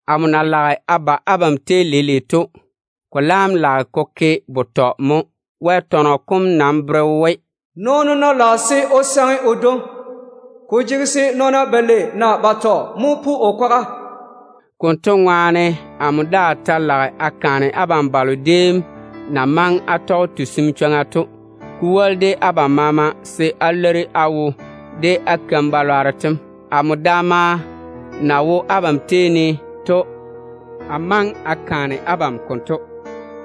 Amo na lage a ba abam tei leile to, ko laam lage ko ke betɔ mo. Wɛ tɔnɔ kom nam bere we, “Nɔɔno ná lage se o saŋe o dwoŋi, ko jege se nɔɔna balei naa batɔ mo pu o kwaga.” Konto ŋwaane, amo daa ta lage a kaane abam balo déem na maŋe á tɔge tusim chwoŋa to, ko woli de abam maama, se á leiri á wo de á keim-balwaaro tem. Amo daama na wo abam tei ne to, a maŋe a kaane abam konto.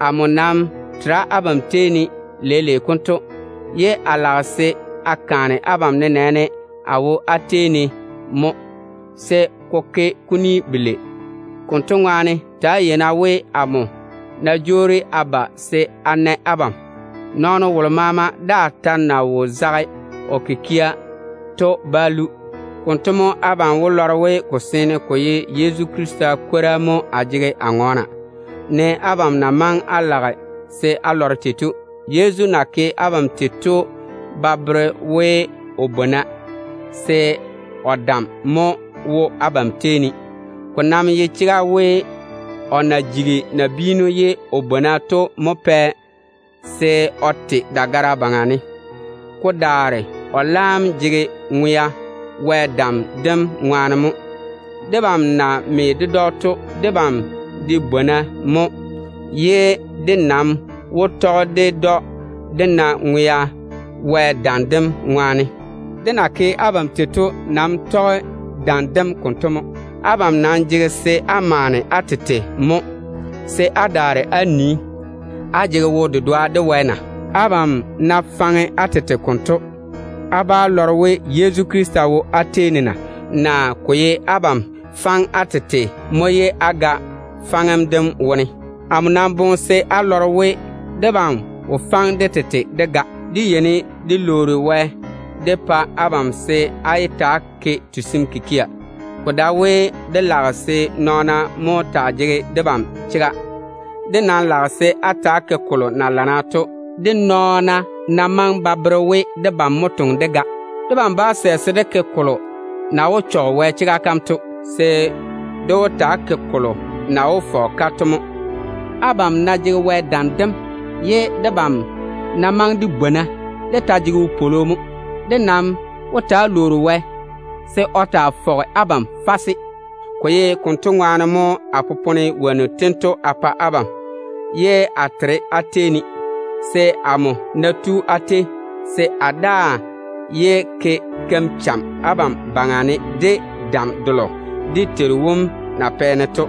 Amo nam tera abam tei ne leile konto, ye a lage se a kaane abam nenɛɛne a wo á tei ne mo, se ko ke kuni belei. Konto ŋwaane, ta‑á yei-na we, amo ná jwoori a ba se a na abam, nɔɔno wolo maama daa ta na wo zage o kikia to bá lu. Konto mo abam wó lɔre we ko seene ko ye Yezu Krista kwora mo a jege a ŋɔɔna, ne abam na maŋe á lage se á lɔre tei to. Yezu na ke abam tei to ba bere we o bwona, se o dam mo wo abam tei ne. Ko nam ye chega we, o na jigi nabiinu ye o bwona to mo pɛ se o te dagara yuu ne. Ko daare o laam jege ŋwea Wɛ dam dem ŋwaane mo. Debam na me ded‑o to, debam de bwona mo. Dé nam ná tu abam tei ye dé toŋe tei to wó tɔge Wɛ dam dem ŋwaane, dé na me de Yezu ye dé ŋwe to ŋwaane. Abam nam jege se á maane á tete mo, se á daare á nii, á tɔge Wɛ de wo-dedoa na. Abam ná faŋe á tete konto, á bá lɔre we Yezu Krista wo á tei ne na? Naa ko ye abam faŋe á tete mo ye á ga? Amo nam boŋe se á lɔre we, debam mo wo faŋe dé tete dé ga. Dé yeini dé lwoori Wɛ dé pa abam se á yé ta‑á ke tusim kikia. Ko dae we dé lage se nɔɔna mo taa jege debam chega. Dé nam lage se á ta‑á ke kolo na lana to, de nɔɔna ná maŋe ba bere we debam mo toŋe dé ga de. Debam bá sɛ se dé ke kolo na wó chɔge Wɛ chega kam to. Dé nam wó taa ke kolo na wó fɔge-ka to mo. Abam ná jege Wɛ dam dem, ye debam ná maŋe de bwona, dé ta jege wopwolo mo. Dé nam wó taa lwoori Wɛ se o taa fɔge abam fase. Ko ye konto ŋwaane mo a popone wonnu tento a pa abam ye a tera á tei ne, se amo ná tu á tei, se a daa yé ke keim-chɛɛre abam baŋa ne de dam delo dé Teiru wom na pɛ-ne to.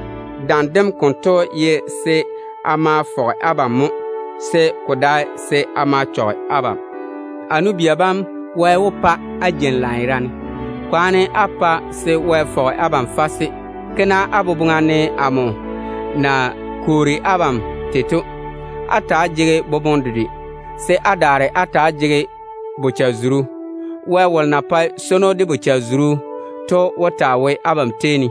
Dam dem konto ye se a ma a fɔge abam mo, se ko dae se a ma a chɔge abam. A nu-bia bam, Wɛ wó pa á jeini lanyerane. Kwaane á pa se Wɛ fɔge abam fase. Ke-na á boboŋa ne amo na kwoori abam tei to. Ta‑á jege-na boboŋe dedwe, se á daare á ta‑á jege bochare-zuru. Wɛ wolo na pae swono de bochare-zuru to wó taa wo abam tei ne.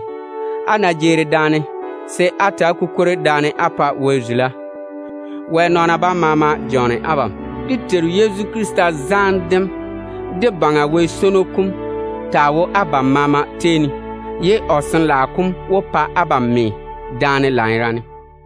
Á ná jeeri daane, se á ta‑á kukwori daane á pa Wɛ zula. Wɛ nɔɔna bam maama jɔɔne abam. Dé Teiru Yezu Krista zaane dem, de Baŋa Wɛ swono kom taa wo abam maama tei ne, se o Sin-laao kom de pa á me daane lanyerane.